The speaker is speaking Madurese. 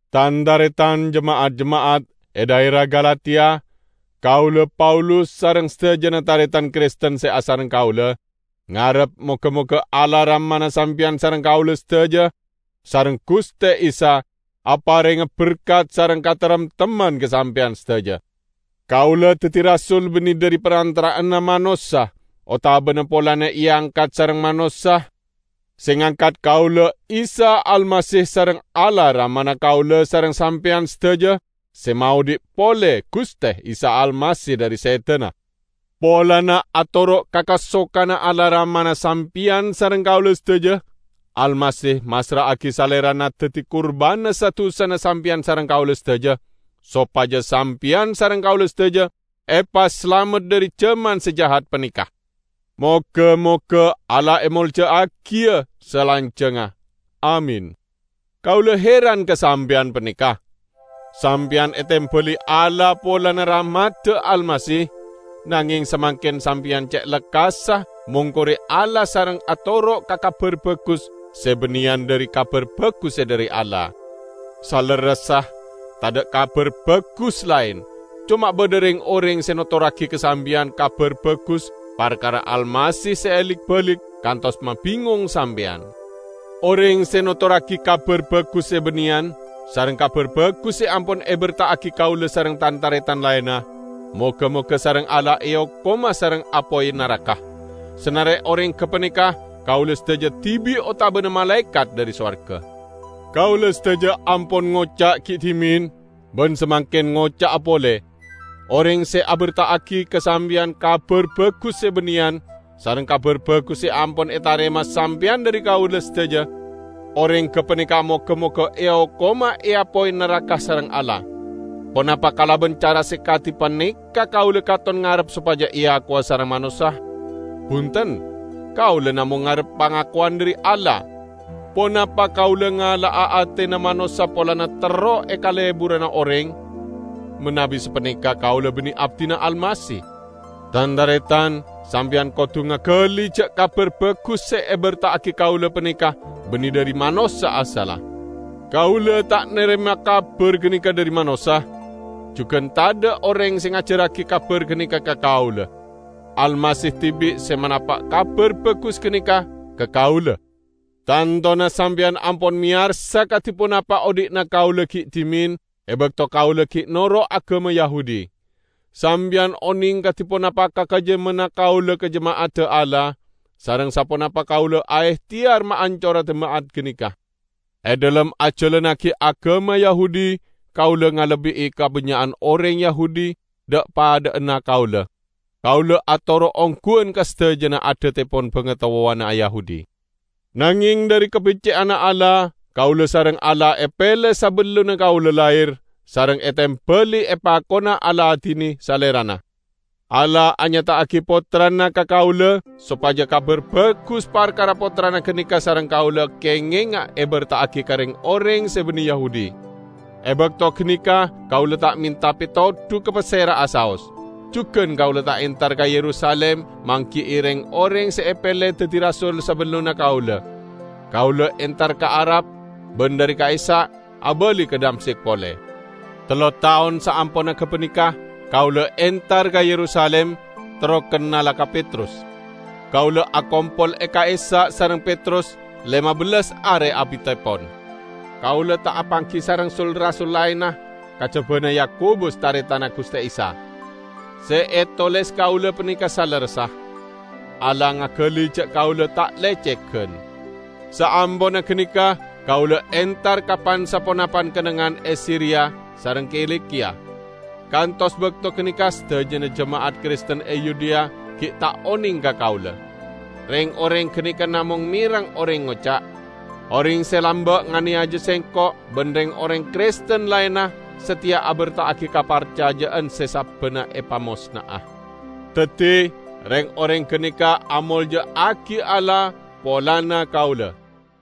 Tan-taretan jema'at-jema'at e dhaera Galatia, Kaula, Paulus, sareng sadajana taretan Kristen se asareng kaula, ngarep moga-moga Allah Ramana sampeyan sareng kaula sadaja sareng Guste Isa aparenga berkat sareng kataremtemman ka sampeyan sadaja. Kaula daddi rasul banne dhari parantara'anna manossa, otabana polana eangkat sareng manossa; se ngangkat kaula Isa Almasih sareng Allah Ramana kaula sareng sampeyan sadaja se maodhi' pole Guste Isa Almasih dhari sedana. Polana atoro' ka kasokanna Allah Ramana sampeyan sareng kaula sadaja, Almasih massra'agi Salerana daddi kurbanna sa-dusana sampeyan sareng kaula sadaja, sopaja sampeyan sareng kaula sadaja epasalamet dhari jaman se jahat paneka. Moga-moga Allah emolja'agiya salanjangnga. Amin. Kaula heran ka sampeyan paneka! Sampeyan etembali Allah polana rahmadda Almasih, nangeng samangken sampeyan ce' lekkassa mongkore Allah sareng atoro' ka "kabar bagus" se banneyan dhari Kabar Bagus se dhari Allah. Salerressa tadha' "kabar bagus" laen. Coma badha reng-oreng se notorragi ka sampeyan "kabar bagus" parkara Almasih se elik-balik kantos mabingong sampeyan. Oreng se notorragi "kabar bagus" se banneyan sareng Kabar Bagus se ampon eberta'agi kaula sareng tan-taretan laenna, moga-moga sareng Allah eokoma sareng apoy naraka, sanare oreng gapaneka kaula sadaja dibi' otabana malaekat dhari sowarga! Kaula sadaja ampon ngoca' gi' dhimen, ban samangken ngoca'a pole: Oreng se aberta'agi ka sampeyan "kabar bagus" se banneyan sareng Kabar Bagus se ampon etarema sampeyan dhari kaula sadaja, oreng gapaneka moga-moga eokoma e apoy naraka sareng Allah! Ponapa kalaban cara se kadi paneka kaula katon ngarep sopaja eakowa sareng manossa? Bunten! Kaula namong ngarep pangakowan dhari Allah. Ponapa kaula ngala'a atena manossa polana terro ekaleburana oreng? Manabi sapaneka, kaula banne abdina Almasih. Tan-taretan, sampeyan kodu ngagali ja' Kabar Bagus se eberta'agi kaula paneka banne dhari manossa asalla. Kaula ta' narema kabar ganeka dhari manossa, jugan tadha' oreng se ngajarragi kabar ganeka ka kaula. Almasih dibi' se manapa' Kabar Bagus ganeka ka kaula. Tantona sampeyan ampon meyarsa kadi ponapa odhi'na kaula gi' dhimen e bakto kaula gi' noro' agama Yahudi. Sampeyan oneng kadi ponapa kakejjemmanna kaula ka jema'adda Allah, sareng saponapa kaula aehteyar maancora jema'at ganeka. E dhalem ajalannagi agama Yahudi, kaula ngalebbi'i kabannya'an oreng Yahudi dha'-padha'anna kaula. Kaula atoro' ongguwan ka sadajana adattepon bangatowana Yahudi. Nangeng dhari kabecce'anna Allah, kaula sareng Allah epele sabellunna kaula lahir, sareng etembali epakona aladine Salerana. Allah anyata'agi Pottrana ka kaula sopaja Kabar Bagus parkara Pottrana ganeka sareng kaula kengenga eberta'agi ka reng-oreng se banne Yahudi. E bakto ganeka kaula ta' menta petodu ka pasera'a saos; jugan kaula ta' entar ka Yerusalim manggi'i reng-oreng se epele daddi rasul sabellunna kaula. Kaula entar ka Arab, ban dhari ka'issa' abali ka Damsyik pole. Tello taon saamponna gapaneka kaula entar ka Yerusalim terro kennala ka Petrus. Kaula akompol e ka'issa' sareng Petrus lema bellas are abittepon. Kaula ta' apanggi sareng sul-rasul laenna, kajabana Yakobus, taretanna Guste Isa. Se etoles kaula paneka salerressa. Allah ngagali ja' kaula ta' lecegan! Saamponna ganeka kaula entar ka pan-saponapan kennengngan e Siria sareng Kilikiya. Kantos bakto ganeka sadajana jema'at Kristen e Yudea gi' ta' oneng ka kaula. Reng-oreng ganeka namong mereng oreng ngoca', "Oreng se lamba' nganeyaja sengko' ban reng-oreng Kristen laenna, sateya aberta'agi kaparcaja'an se sabbanna epamosna'a." Daddi reng-oreng ganeka amolja'agi Allah polana kaula.